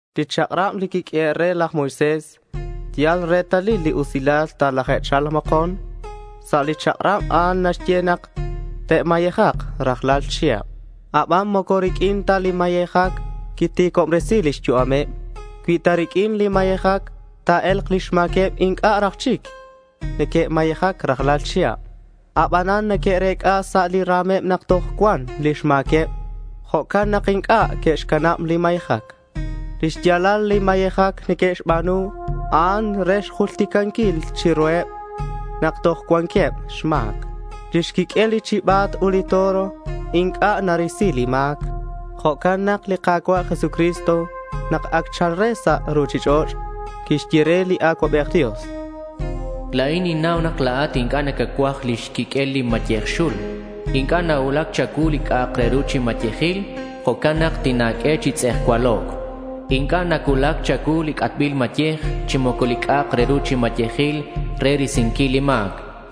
Li chak'rab li quiq'uehe' re laj Moisés yal retalil li usilal talaje'cha̱lk mokon. Sa' li chak'rab a'an naxye nak te'mayejak rajlal chihab aban moco riq'uin ta li mayejac quiti̱cobresi̱c lix yu'ameb. Cui ta riq'uin li mayejac ta̱e̱lk lix ma̱queb inc'a' raj chic neque'mayejac rajlal chihab. Abanan neque'rec'a sa' li ra̱meb nak toj cuan lix ma̱queb. Jo'can nak inc'a' que'xcanab li mayejac. Lix ya̱lal li mayejac neque'xba̱nu a'an re xjulticanquil chiruheb nak toj cuanqueb xma̱c. Lix quiq'uel li chiba̱t ut li toro inc'a' narisi li ma̱c. Jo'can nak li Ka̱cua' Jesucristo, nak ac cha̱lc re sa' ruchich'och', quixye re li Acuabej Dios: La̱in ninnau nak la̱at inc'a' nacacuaj lix quiq'uel li mayej xul. Inc'a' nacuulac cha̱cuu li c'a'ak re ru chi mayejil. Jo'can nak tina̱q'ue chi tz'ejcualoc'. Inc'a' nacuulac cha̱cuu li c'atbil mayej chi moco li c'a'ak re ru chi mayejil re risinquil li ma̱c.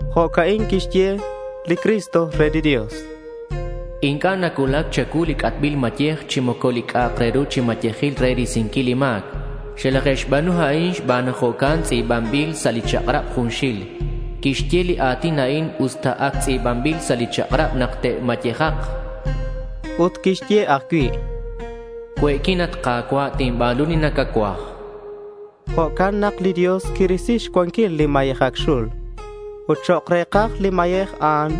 Jo'ca'in quixye li Cristo re li Dios: Inc'a' nacuulac cha̱cuu li c'atbil mayej chi moco li c'a'ak re ru chi mayejil re risinquil li ma̱c. Xelaje'xba̱nu a'in xban nak jo'can tz'i̱banbil sa' li chak'rab junxil. Quixye li a̱tin a'in usta ac tz'i̱banbil sa' li chak'rab nak te'mayejak. Ut quixye ajcui': Cue'quin, at Ka̱cua'. Tinba̱nu li nacacuaj, chan. Jo'can nak li Dios quirisi xcuanquil li mayejac xul ut chok' re̱kaj li mayej a'an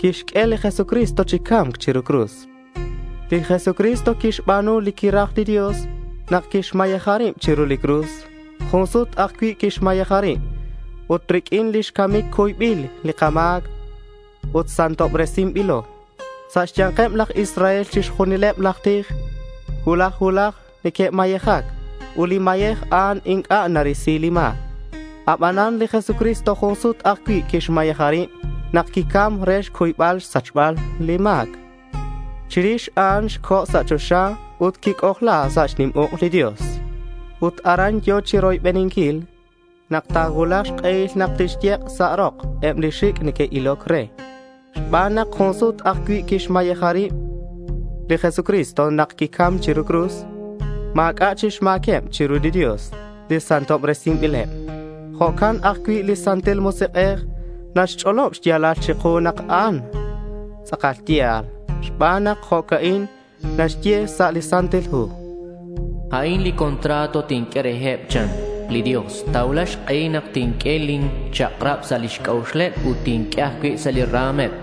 quixq'ue li Jesucristo chi ca̱mc chiru li cruz. Li Jesucristo quixba̱nu li quiraj li Dios nak quixmayeja rib chiru li cruz. Jun sut ajcui' quixmayeja rib, ut riq'uin lix camic cuybil li kama̱c ut santobresinbilo. Sa' xya̱nkeb laj Israel, chixjunileb laj tij cuulaj cuulaj neque'mayejac ut li mayej a'an inc'a' narisi li ma̱c. Abanan li Jesucristo jun sut ajcui' quixmayeja rib nak quicam re xcuybal xsachbal li ma̱c. Chirix a'an co̱ sa' choxa ut quic'ojla sa' xnim uk' li Dios. Ut aran yo̱ chiroybeninquil nak ta̱cuulak xk'ehil nak tixyek' sa' rok eb li xic' neque'iloc re. Xban nak jun sut ajcui' quixmayeja rib li Jesucristo nak quicam chiru li cruz, ma̱c'a' chic xma̱queb chiru li Dios li santobresinbileb. Jo'can ajcui' li Santil Musik'ej naxch'olob xya̱lal chiku nak a'an tz'akal ya̱l xban nak jo'ca'in naxye sa' li Santil Hu: A'in li contrato tinq'ue reheb, chan li Dios. Ta̱cuulak xk'ehil nak tinq'ue lin chak'rab sa' lix c'a'uxeb ut tinq'ue ajcui' sa' li ra̱meb.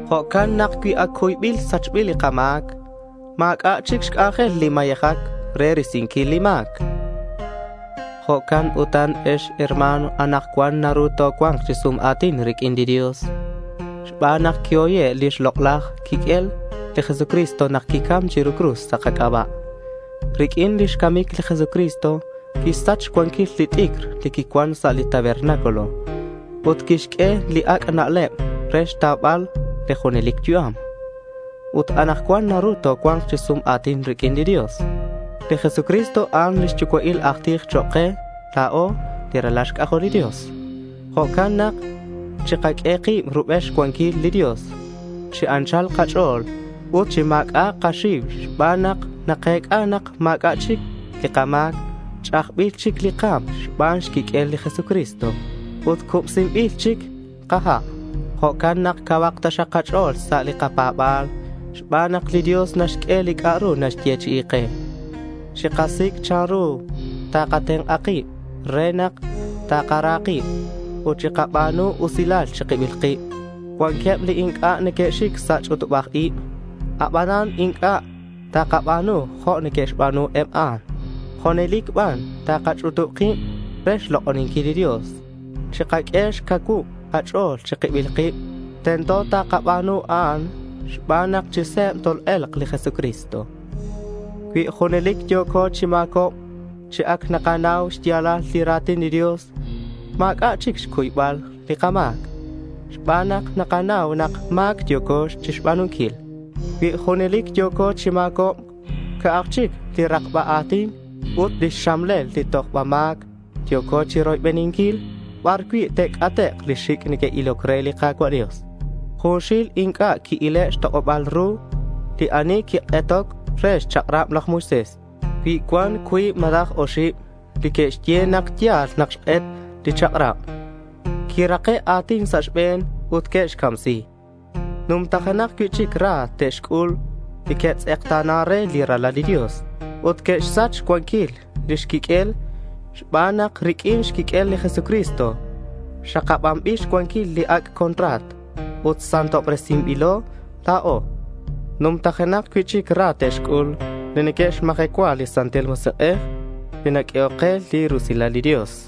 Jo'can nak cui ac cuybil sachbil li kama̱c, ma̱c'a' chic xc'anjel li mayejac re risinquil li ma̱c. Jo'can utan ex herma̱n, anakcuan naru tocua̱nk chi sum a̱tin riq'uin li Dios xban nak quihoye' lix lok'laj quiq'uel li Jesucristo nak quicam chiru li cruz sa' kac'aba'. Riq'uin lix camic li Jesucristo quixsach xcuanquil li t'icr li quicuan sa' li tabernáculo ut quixq'ue li ac' na'leb re xtaubal li junelic yu'am ut anakcuan naru tocua̱nk chi sum a̱tin riq'uin li Dios. Li Jesucristo, a'an lix yucua'il aj tij chok' ke la̱o li ralal xc'ajol li Dios. Jo'can nak chikaq'ue kib rubel xcuanquil li Dios chi anchal kach'o̱l ut chi ma̱c'a'ak kaxiu xban nak nakec'a nak ma̱c'a' chic li kama̱c. Ch'ajbil chic li ka̱m xban xquiq'uel li Jesucristo ut cubsinbil chic kaha'. Jo'can nak cauhak taxak kach'o̱l sa' li kapa̱ba̱l xban nak li Dios naxq'ue li c'a'ru naxyechi'i ke. Chikasic' chanru takatenk'a kib re nak takara kib ut chikaba̱nu usilal chi kibil kib. Cuanqueb li inc'a' neque'xic sa' li ch'utubaj ib. Abanan inc'a' takaba̱nu jo' neque'xba̱nu eb a'an. Junelic ban takach'utub kib re xlok'oninquil li Dios. Chikaq'ue xcacuub li kach'o̱l chi kibil kib. Tento takaba̱nu a'an xban nak chi se̱b tol-e̱lk li Jesucristo. Cui junelic yo̱co chi ma̱cobc chi ac nakanau xya̱lal li ra̱tin li Dios, ma̱c'a' chic xcuybal li kama̱c xban nak nakanau nak ma̱c yo̱co chixba̱nunquil. Cui junelic yo̱ko chi ma̱cobc, ca'aj chic li rakba a̱tin ut lix xamlel li tojba ma̱c yo̱co chiroybeninquil bar cui' te'c'atek' li xic' neque'iloc re li Ka̱cua' Dios. Junxil inc'a' qui-ile' xtok'oba̱l ru li ani quik'etoc re xchak'rab laj Moisés. Cui cuan cuib malaj oxib li que'xye nak ya̱l nak xk'et li chak'rab, quirake' a̱tin sa' xbe̱n ut que'xcamsi. Numtajenak cui'chic ra te'xc'ul li neque'tz'ekta̱nan re li Ralal li Dios ut neque'xsach xcuanquil lix quiq'uel xban nak riq'uin xquiq'uel li Jesucristo xakabanbil xcuanquil li ac' contrato ut santobresinbilo la̱o. Numtajenak cui'chic ra te'xc'ul li neque'xmajecua li Santil Musik'ej li naq'uehoc ke li rusilal li Dios.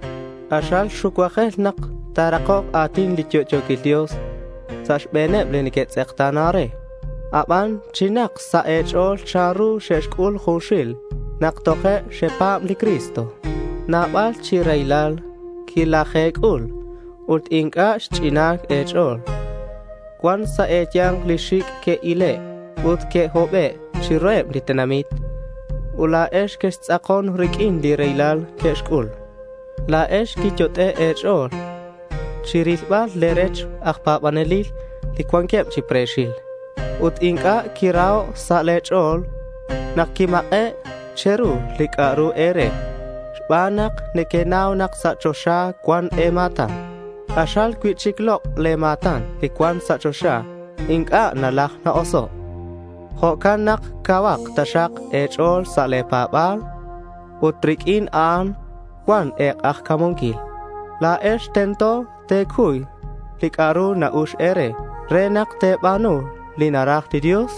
K'axal xucuajel nak ta̱rakok a̱tin li yo'yo̱quil Dios sa' xbe̱neb li neque'tz'ekta̱nan re. Aban chinak sa' e̱ch'o̱l chanru xec'ul junxil nak toje' xepa̱b li Cristo. Nabal chi raylal quilaje̱c'ul ut inc'a' xch'inan e̱ch'o̱l. Cuan sa' e̱ya̱nk li xic' que'ile' ut que'hobe' chiruheb li tenamit. Ut la̱ex quextz'akon riq'uin li raylal li que'xc'ul. La̱ex quiyot'e' e̱ch'o̱l chi rilbal le̱ rech aj pa̱banelil li cuanqueb chi pre̱xil. Ut inc'a' quiraho' sa' le̱ ch'o̱l nak quimak'e' che̱ru li c'a'ru e̱re xban nak nequenau nak sa' li choxa cuan e̱ma̱tan k'axal cui'chic lok'. Le̱ ma̱tan li cuan sa' choxa inc'a' nalaj inc'a' na-oso'. Jo'can nak cauhak taxak e̱ch'o̱l sa' le̱ pa̱ba̱l ut riq'uin a'an cuan e̱k'ajca̱munquil. La̱ex tento te̱cuy li c'a'ru na-ux e̱re re nak te̱ba̱nu li naraj li Dios.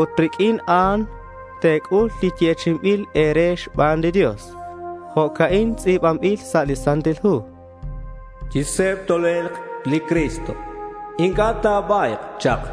Ut riq'uin a'an te̱c'ul li yechi'inbil e̱re xban li Dios. Jo'ca'in tz'i̱banbil sa' li Santil Hu: Chi se̱b tol-e̱lk li Cristo. Inc'a' ta̱ba̱yk chak.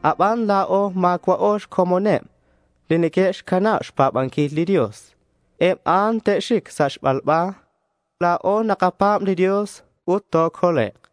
Aban, la̱o ma̱cua'o xcomoneb li neque'xcanab xpa̱banquil li Dios. Eb a'an te'xic sa' xbalba. La̱o nakapa̱b li Dios ut tocolek'.